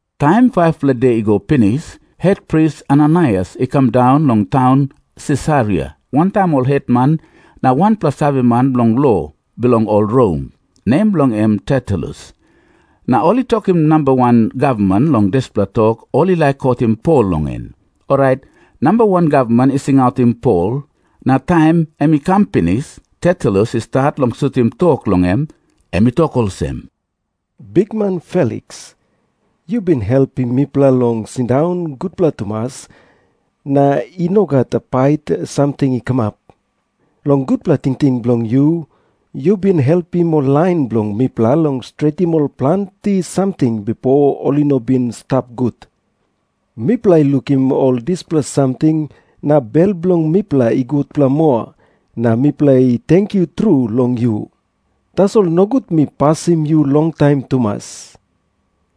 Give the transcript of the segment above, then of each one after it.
Taim 5-pela de i go pinis, hetpris Ananaias i kam daun long taun Sisaria wantaim ol hetman na wanpela saveman bilong lo bilong ol Rom, nem bilong en Tertulus. Na ol i tokim namba wan gavman long dispela tok ol i laik kotim Pol long en. Orait namba wan gavman i singautim Pol, na taim em i kam pinis, Tertulus i stat long sutim tok long em. Em i tok olsem, “Bikman Feliks, yu bin helpim mipela long sindaun gutpela tumas, na i no gat pait samting i kamap. Long gutpela tingting bilong yu, yu bin helpim ol lain bilong mipela long stretim ol planti samting bipo ol i no bin i stap gut. Mipela i lukim ol dispela samting, na bel bilong mipela i gutpela moa, na mipela i tenkyu tru long yu. “Tasol nogut mi pasim yu longtaim tumas.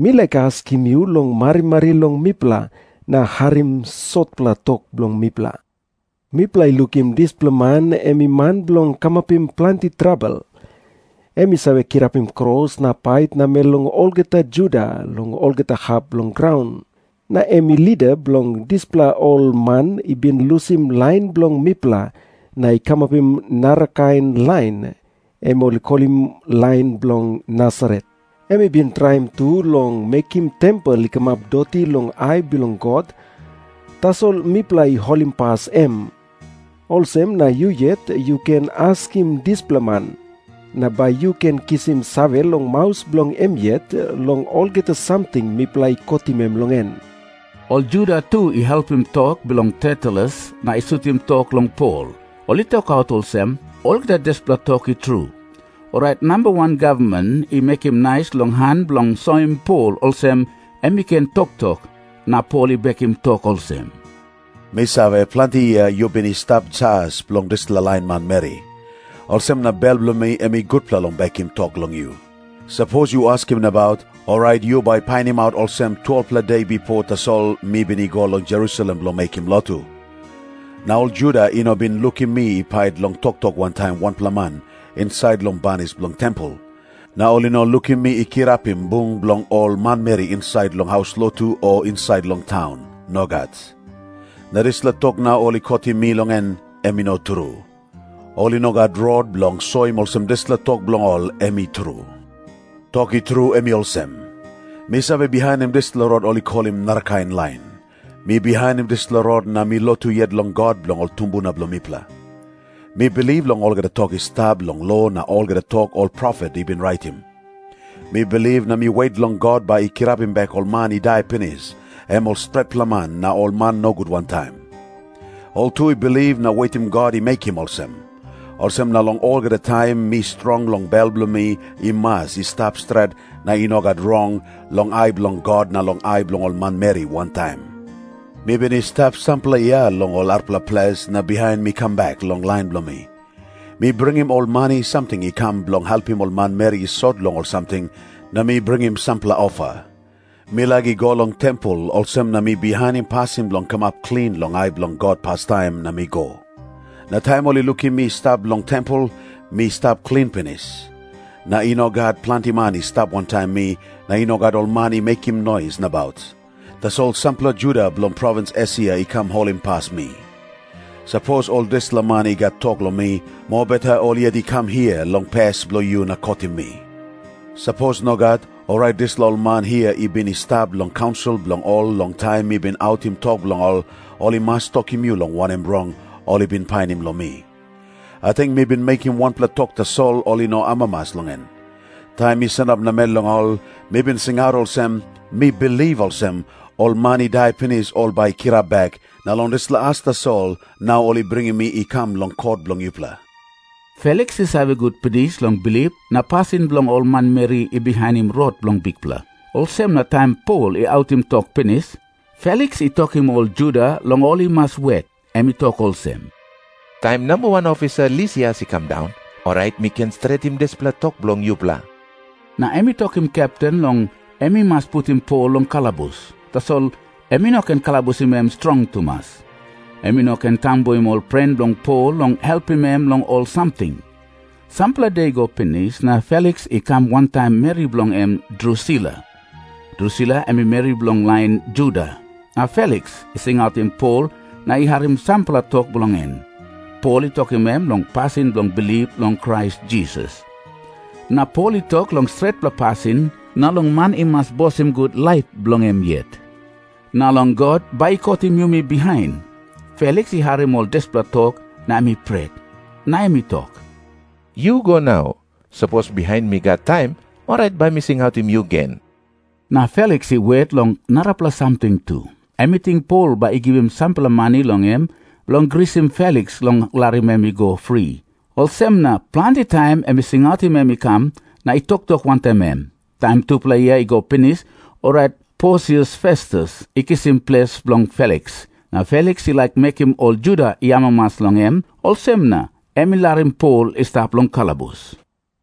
Mi laik askim yu long marimari long mipela na harim sotpela tok bilong mipela. Mipela i lukim dispela man em i man bilong kamapim planti trabel. Em i save kirapim kros na pait namel long olgeta Juda long olgeta hap bilong graun. Na em i lida bilong dispela ol man i bin lusim lain bilong mipela na i kamapim narakain lain, em ol i kolim lain bilong Nasaret. Em i bin traim tu long mekim tempel i kamap doti long ai bilong God, tasol mipela i holimpas em. Olsem na yu yet yu ken askim dispela man, na bai yu ken kisim save long maus bilong em yet long olgeta samting mipela i kotim em long en.” Ol Juda tu i helpim tok bilong Tertulus na i sutim tok long Pol. Ol i tokaut olsem, “Olgeta dispela tok i tru.” Orait namba wan gavman i mekim nais long han bilong soim Pol olsem em i ken toktok, na Pol i bekim tok olsem, “Mi save, planti yia yu bin i stap jas bilong dispela lain manmeri. Olsem na bel bilong mi em i gutpela long bekim tok long yu. Sapos yu askim nabaut, orait yu bai painimaut olsem, 12-pela de bipo tasol mi bin i go long Jerusalem bilong mekim lotu. Na ol Juda i no bin lukim mi i pait long toktok wantaim wanpela man insait long banis bilong tempel. Na ol i no lukim mi i kirapim bung bilong ol manmeri insait long ol haus lotu o insait long taun. Nogat. Na dispela tok nau ol i kotim mi long en, em i no tru. Ol i no gat rot bilong soim olsem dispela tok bilong ol em i tru. “Tok i tru, em i olsem. Mi save bihainim dispela Rot ol i kolim ‘narakain lain’. Mi bihainim dispela Rot na mi lotu yet long God bilong ol tumbuna bilong mipela. Mi bilip long olgeta tok i stap long lo na olgeta tok ol profet i bin raitim. Mi bilip na mi wet long God bai i kirapim bek ol man i dai pinis, em ol stretpela man na ol man nogut wantaim. Ol tu i bilip na wetim God i mekim olsem. Olsem na long olgeta taim mi strong long bel bilong mi i mas i stap stret na i no gat rong, long ai bilong God na long ai bilong ol manmeri wantaim. “Mi bin i stap sampela yia long ol arapela ples, na bihain mi kam bek long lain bilong mi. Mi bringim ol mani samting i kam bilong helpim ol manmeri i sot long ol samting, na mi bringim sampela ofa. Mi laik i go long tempel, olsem na mi bihainim pasin bilong kamap klin long ai bilong God pastaim, na mi go. Na taim ol i lukim mi i stap long tempel, mi stap klin pinis. Na i no gat planti man i stap wantaim mi, na i no gat ol man i mekim nois nabaut. Tasol sampela Juda bilong provins Esia i kam holimpas mi. Sapos ol dispela man i gat tok long mi, mobeta ol yet i kam hia long pes bilong yu na kotim mi. Sapos nogat, orait dispela ol man hia i bin i stap long kaunsil bilong ol long taim mi bin autim tok long ol, ol i mas tokim yu long wanem rong ol i bin painim long mi. Ating mi bin mekim wanpela tok tasol ol i no amamas long en. Taim mi sanap namel long ol, mi bin singaut olsem, ‘Mi bilip olsem, ol man i dai pinis ol bai i kirap bek, na long dispela as tasol nau ol i bringim mi i kam long kot bilong yupela.’” Feliks i save gut pinis long bilip na pasin bilong ol manmeri i bihainim Rot bilong Bikpela, olsem na taim Pol i autim tok pinis, Feliks i tokim ol Juda long ol i mas wet. Em i tok olsem, “Taim namba wan ofisa Lisias i kam daun, orait mi ken stretim dispela tok bilong yupela.” Na em i tokim kepten long em i mas putim Pol long kalabus, tasol em i no ken kalabusim em strong tumas. Em i no ken tambuim ol pren bilong Pol long helpim em long ol samting. Sampela de i go pinis, na Feliks i kam wantaim meri bilong en Drusila. Drusila em i meri bilong lain Juda. Na Feliks i singautim Pol na i harim sampela tok bilong en. Pol i tokim em long pasin bilong bilip long Krais Jisas. Na Pol i tok long stretpela pasin, na long man i mas bosim gut laip bilong em yet, na long God bai i kotim yumi bihain. Feliks i harim ol dispela tok na em i pret. Na em i tok, “Yu go nau. Sapos bihain mi gat taim, orait bai mi singautim yu gen.” Na Feliks i wet long narapela samting tu. Em i ting Pol bai i givim sampela mani long em bilong grisim Feliks long larim em i go fri. Olsem na planti taim em i singautim em i kam na i toktok wantaim em. Taim tupela yia i go pinis, orait Porsius Festus i kisim ples bilong Feliks. Na Feliks i laik mekim ol Juda i amamas long em, olsem na em i larim Pol i stap long kalabus.